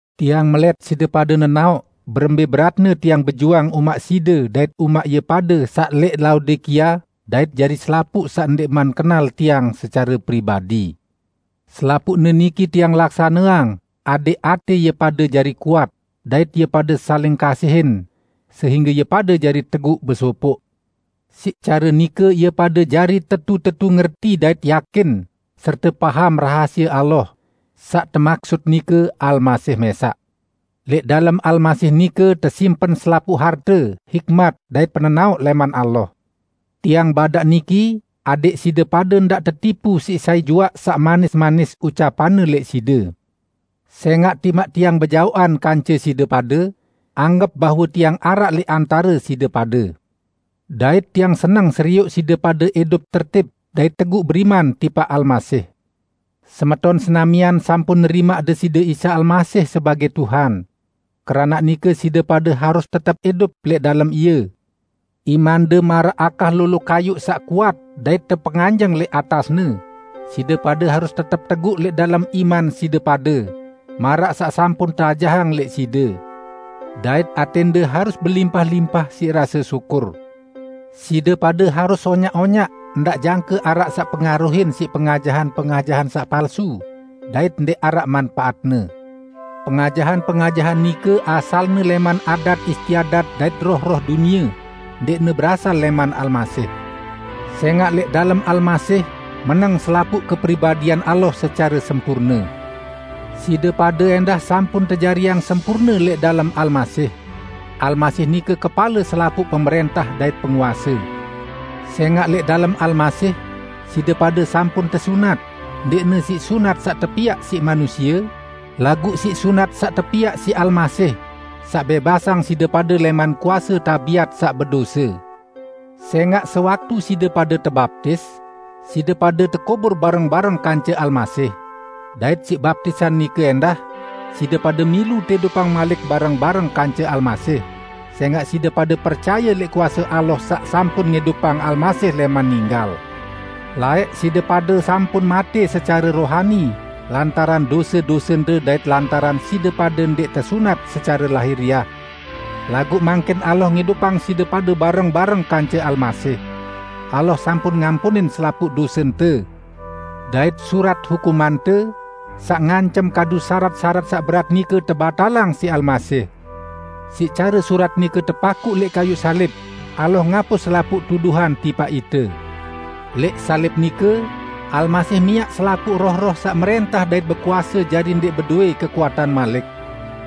Tiang melẽt side pade nenaoq berembẽ beratne tiang bejuang umaq side dait umaq ie pade saq lẽq Laodikia dait jari selapuq saq ndẽqman kenal tiang secare pribadi. Selapuqne niki tiang laksaneang adẽq atẽ ie pade jari kuat dait ie pade saling kasihin sehingge ie pade jari teguq besopoq. Siq care nike ie pade jari tetu-tetu ngerti dait yakin serte paham rahasie Allah, saq temaksut nike Almasih mẽsaq. Lẽq dalem Almasih nike tesimpen selapuq harte hikmat dait penenaoq lẽman Allah. Tiang badaq niki adẽq side pade ndaq tetipu siq sai juaq saq manis-manis ucapanne lẽq side. Sẽngaq timaq tiang bejaoqan kance side pade, anggep bahwe tiang araq lẽq antare side pade. Dait tiang seneng serioq side pade idup tertib dait teguq beriman tipaq Almasih. Semeton senamian sampun nerimaq Deside Isa Almasih sebagẽ Tuhan. Keranaq nike side pade harus tetep idup lẽq dalem Ie, imande maraq akah lolo kayuq saq kuat dait tepenganjeng lẽq atas-Ne, side pade harus tetep teguq lẽq dalem iman side pade, maraq saq sampun teajahang lẽq side. Dait atẽnde harus belimpah-limpah siq rase syukur. Side pade harus onyaq-onyaq ndaq jangke araq saq pengaruhin siq pengajahan-pengajahan saq palsu dait ndẽq araq manpaatne. Pengajahan-pengajahan nike asalne lẽman adat istiadat dait roh-roh dunie, ndẽqne berasal lẽman Almasih. Sẽngaq lẽq dalem Almasih meneng selapuq kepribadian Allah secare sempurne. Side pade ẽndah sampun tejariang sempurne lẽq dalem Almasih. Almasih nike kepale selapuq pemrẽntah dait penguase. Sẽngaq lẽq dalem Almasih, side pade sampun tesunat, ndẽqne siq sunat saq tepiaq siq manusie, laguq siq sunat saq tepiaq siq Almasih, saq bẽbasang side pade lẽman kuase tabiat saq bedose. Sẽngaq sewaktu side pade tebaptis, side pade tekubur bareng-bareng kance Almasih; dait siq baptisan nike ẽndah, side pade milu teidupang malik bareng-bareng kance Almasih, sẽngaq side pade percaye lẽq kuase Allah saq sampun ngidupang Almasih lẽman ninggal. Laẽq, side pade sampun matẽ secare rohani lantaran dose-dosende dait lantaran side pade ndẽq tesunat secare lahiriah. Laguq mangkin Allah ngidupang side pade bareng-bareng kance Almasih. Allah sampun ngampunin selapuq dosente, dait surat hukumante, saq ngancem kadu sarat-sarat saq berat nike tebatalang siq Almasih. Siq care surat nike tepakuq lẽq kayuq salib, Allah ngapus selapuq tuduhan tipaq ite. Lẽq salib nike Almasih miaq selapuq roh-roh saq mrẽntah dait bekuase jari ndẽq bedowẽ kekuatan malik.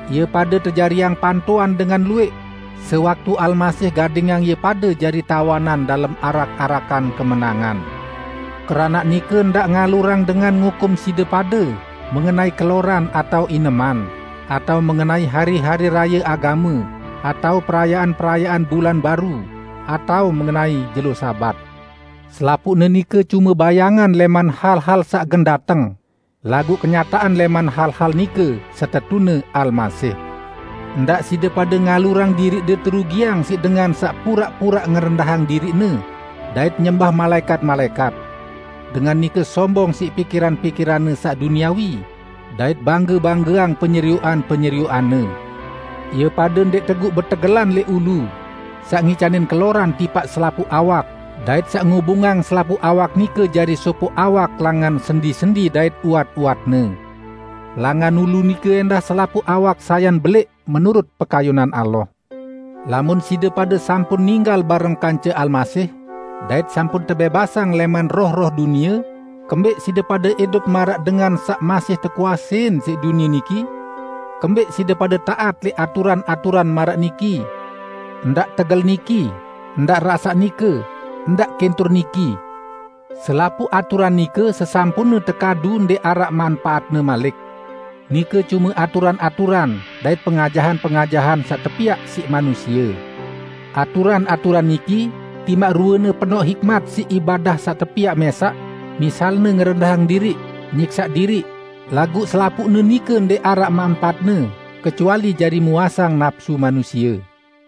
Ie pade tejariang pantoan dengan luwẽq sewaktu Almasih gadingang ie pade jari tawanan dalem arak-arakan kemenangan. Keranaq nike ndaq ngalurang dengan ngukum side pade mengenai keloran atao ineman, atao mengenai hari-hari raye agame, atao perayaan-perayaan bulan baru, atao mengenai jelo Sabat. Selapuqne nike cume bayangan lẽman hal-hal saq gen dateng, laguq kenyataan lẽman hal-hal nike setetune Almasih! Ndaq side pade ngalurang diriqde terugiang siq dengan saq puraq-puraq ngerendahang diriqne dait nyembah malaẽkat-malaẽkat. Dengan nike sombong siq pikiran-pikiranne saq duniawi dait bangge-banggeang penyerioqan-penyerioqanne. Ie pade ndẽq teguq betegelan lẽq Ulu, saq ngicanin keloran tipaq selapuq awak dait saq ngubungang selapuq awak nike jari sopoq awak langan sendi-sendi dait uwat-uwatne. Langan Ulu nike ẽndah selapuq awak sayan belẽq menurut pekayunan Allah. Lamun side pade sampun ninggal bareng kance Almasih, dait sampun tebẽbasang lẽman roh-roh dunie, kembẽq side pade idup maraq dengan saq masih tekuasein siq dunie niki? Kembẽq side pade taat lẽq aturan-aturan maraq niki, "Ndaq tegel niki", "Ndaq rasaq nike", "Ndaq kintur niki?" Selapuq aturan nike sesampunne tekadu ndẽq araq manpaatne malik. Nike cume aturan-aturan dait pengajahan-pengajahan saq tepiaq siq manusie. Aturan-aturan niki, timaq ruene penoq hikmat siq ibadah saq tepiaq mẽsaq, misalne ngerendahang diriq, nyiksaq diriq, laguq selapuqne nike ndẽq araq manpaatne kecuali jari muasang napsu manusie.